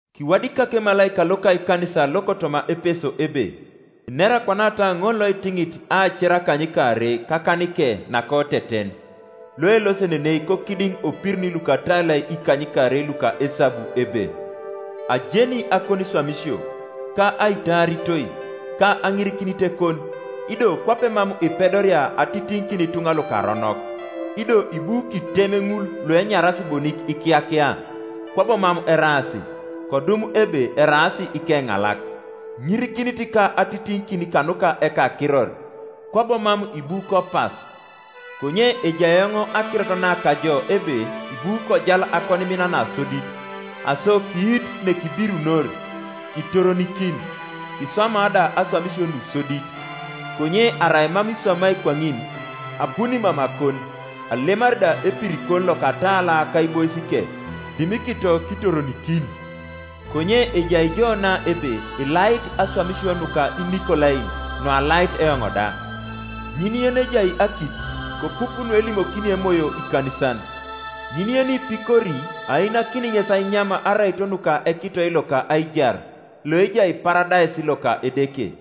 “Kiwadikak emalaika loka ekanisa lokotoma Epeso ebe: Inera kwanata ŋol loitiŋit aacer akanykaarei kakanike nakoteten, loelosenenei kokidiŋ opirin lukatalai ikanykaarei luka esabu ebe: “Ajeni akoniswamisio, ka aitaaritoi, ka aŋirikinitekon, ido kwape mam ipedoria atitiŋikin ituŋa lukaronok, ido ibu kitem ŋul luenyaras bonik ikiyakia, kwabo mam eraas, kodum ebe eraas ikeŋalak, Iŋirikinit ka atitiŋikin kanuka ekakiror, kwabo mam ibu kopas. Konye ejai eoŋ akirot na kajo ebe ibu kojal akonimin nasodit. Aso kiitu nekibirunor, kitoronikin, kiswama da aswamisio nusodit. Konye arai mam iswamai kwaŋin, abuni mamakon, alemari da epirikon lokatala kaiboisike, dimikito kitoronikin. Konye ejai jo na ebe ilait aswamisio nuka Inikolain, nualait eoŋ da. Ŋin yenejai akit, kopup nuelimokini Emoyo ikanisan. Ŋin yenipikori ainakini ŋes ainyam araito nuka ekitoi loka aijar, loejai Paradais loka Edeke.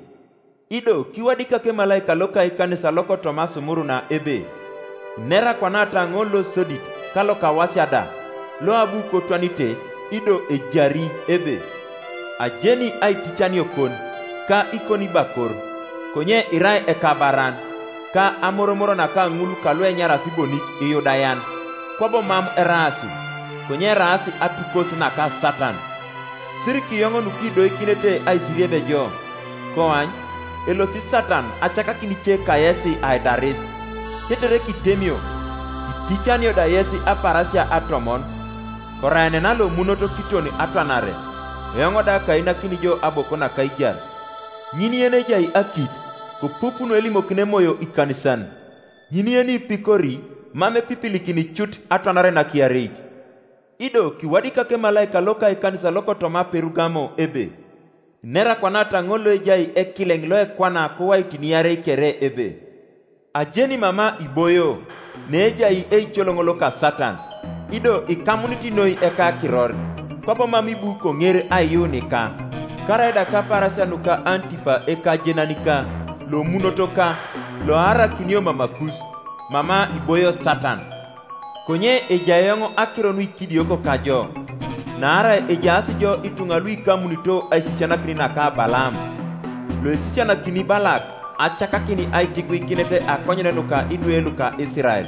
“Ido kiwadikak emalaika loka ekanisa lokotoma Sumuruna ebe: Inera kwanata ŋol losodit ka lokawasia da, loabu kotwanite ido ejari, ebe: “Ajeni aiticaniokon, ka ikonibakor, (konye irai ekabaran) ka amoromor naka ŋul kaluenyaras bonik Iyudayan, kwabo mam eraas, konye eraas atukos naka Satan. Sirikiyoŋ nukidoikinete aisirieb jo, Koany, elosi Satan acakakin ice kayes aidaris, tetere kitemio, kiticanio da yes apaarasia atomon. Koraenena lomunot kiton atwanare, eoŋ da kainakini jo aboko naka aijar. Ŋin yenejai akit, kopup nuelimokini Emoyo ikanisan. Ŋin yenipikori mam epipilikini cut atwanare nakiareit. “Ido kiwadikak emalaika loka ekanisa lokotoma Perugamo ebe: Inera kwanata ŋol loejai ekileŋ loekwana kowaitin iarei kere ebe: “Ajeni mama iboio, neejai eicoloŋ loka Satan; ido ikamunit noi ekakiror, kwabo mam ibu koŋer aiyuunika, karaida kapaarasia nuka Antipa ekajenanika, lomunotoka, loaarakinio mamakus, mama iboio Satan. Konye ejai eoŋ akiro nuikidioko kajo, naarai ejaas jo ituŋa luikamunito aisisianakin naka Balaam, loesisianakini Balak acakakin aitiguikinet akonyen nuka idwe luka Isirael,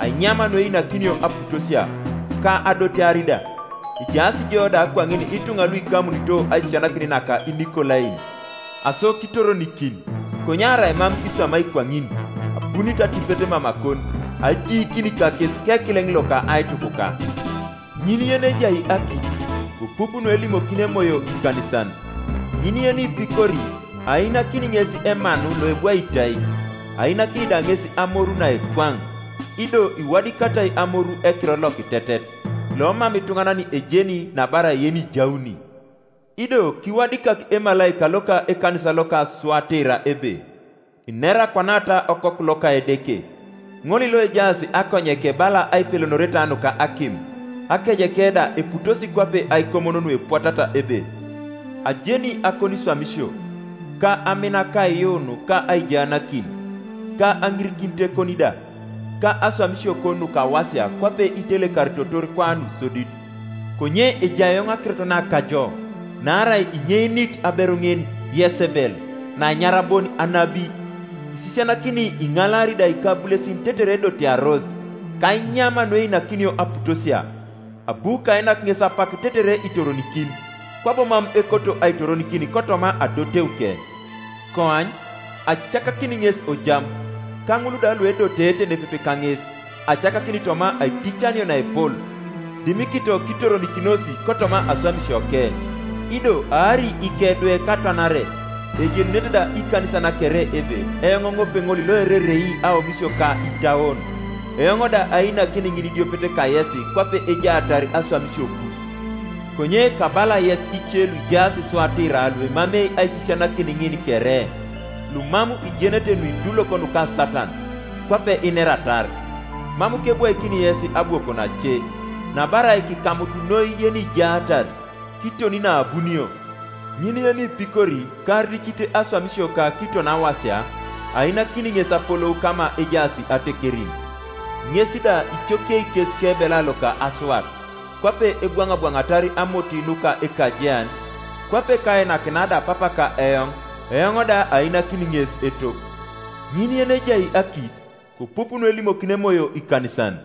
ainyam nueinakinio aputosia, ka adotear da. Ejaas jo da kwaŋin ituŋa luikamunito aisisianakin naka Inikolain, Aso kitoronikin. Konye arai mam iswamai kwaŋin abunit atipet mamakon, ajiikini kakes kekileŋ loka aitukuka. Ŋin yenejai akit, kopup nuelimokini Emoyo ikanisan. Ŋin yenipikori ainakini ŋes emanu loebwaitai, ainakini da ŋes amoru naekwaŋ, ido iwadikatai amoru ekiror lokitetet, lomam ituŋanan ejeni nabarai yenijauni. “Ido kiwadikak emalaika loka ekanisa lokotoma Suatira ebe: Inera kwanata Okoku loka Edeke, ŋol loejaas akonyeke bala aipelonoreta nuka akim, akejeke da eputosi kwape aikomon nuepwatat ebe: “Ajeni akoniswamisio, ka amin ka aiyuun ka aijaanakin, ka aŋirikinitekon da, ka aswamisiokon nukawasia kwape itelekaritotor kwa nusodit. Konye ejai eoŋ akirot na kajo, naarai inyeinit aberu ŋin, Yesebel, naenyara bon anabi, isisianakini iŋalaari da ikabulesin tetere edotearos, ka ainyam nueinakinio aputosia. Abu kainak ŋes apak tetere itoronikin, kwabo mam ekoto aitoronikin kotoma adoteuke. Koany, acakakini ŋes ojam, ka ŋul da luedoteete nepepe kaŋes acakakini toma aiticanio naepol, dimikito kitoronikinos kotoma aswamisioke. Ido aari ikedwe katwanare. Ejenunete da ikanisan kere ebe eoŋ ŋopeŋol loererei aomisio ka itauon, eoŋ da ainakini ŋinidiopet kayesi kwape ejaatar aswamisiokus. Konye kabala yes ice luijaas Suatira luemamei aisisianakin ŋin kere, lumam ijenete nuidulok nuka Satan, kwape ineratar, mam kebwaikini yes abwokon ace; nabarai kikamut noi yenijaatar, kiton naabunio. Ŋin yenipikori, ka aricit aswamisioka kiton awasia, ainakini ŋes apolou kama ejaas atekerin. Ŋes da icokiei kes kebela loka asuat, kwape ebwaŋabwaŋatar amoti nuka ekajean, kwape kainakinia da Papaka eoŋ; eoŋ da ainakini ŋes etop. Ŋin yenejai akit, kopup nuelimokini Emoyo ikanisan.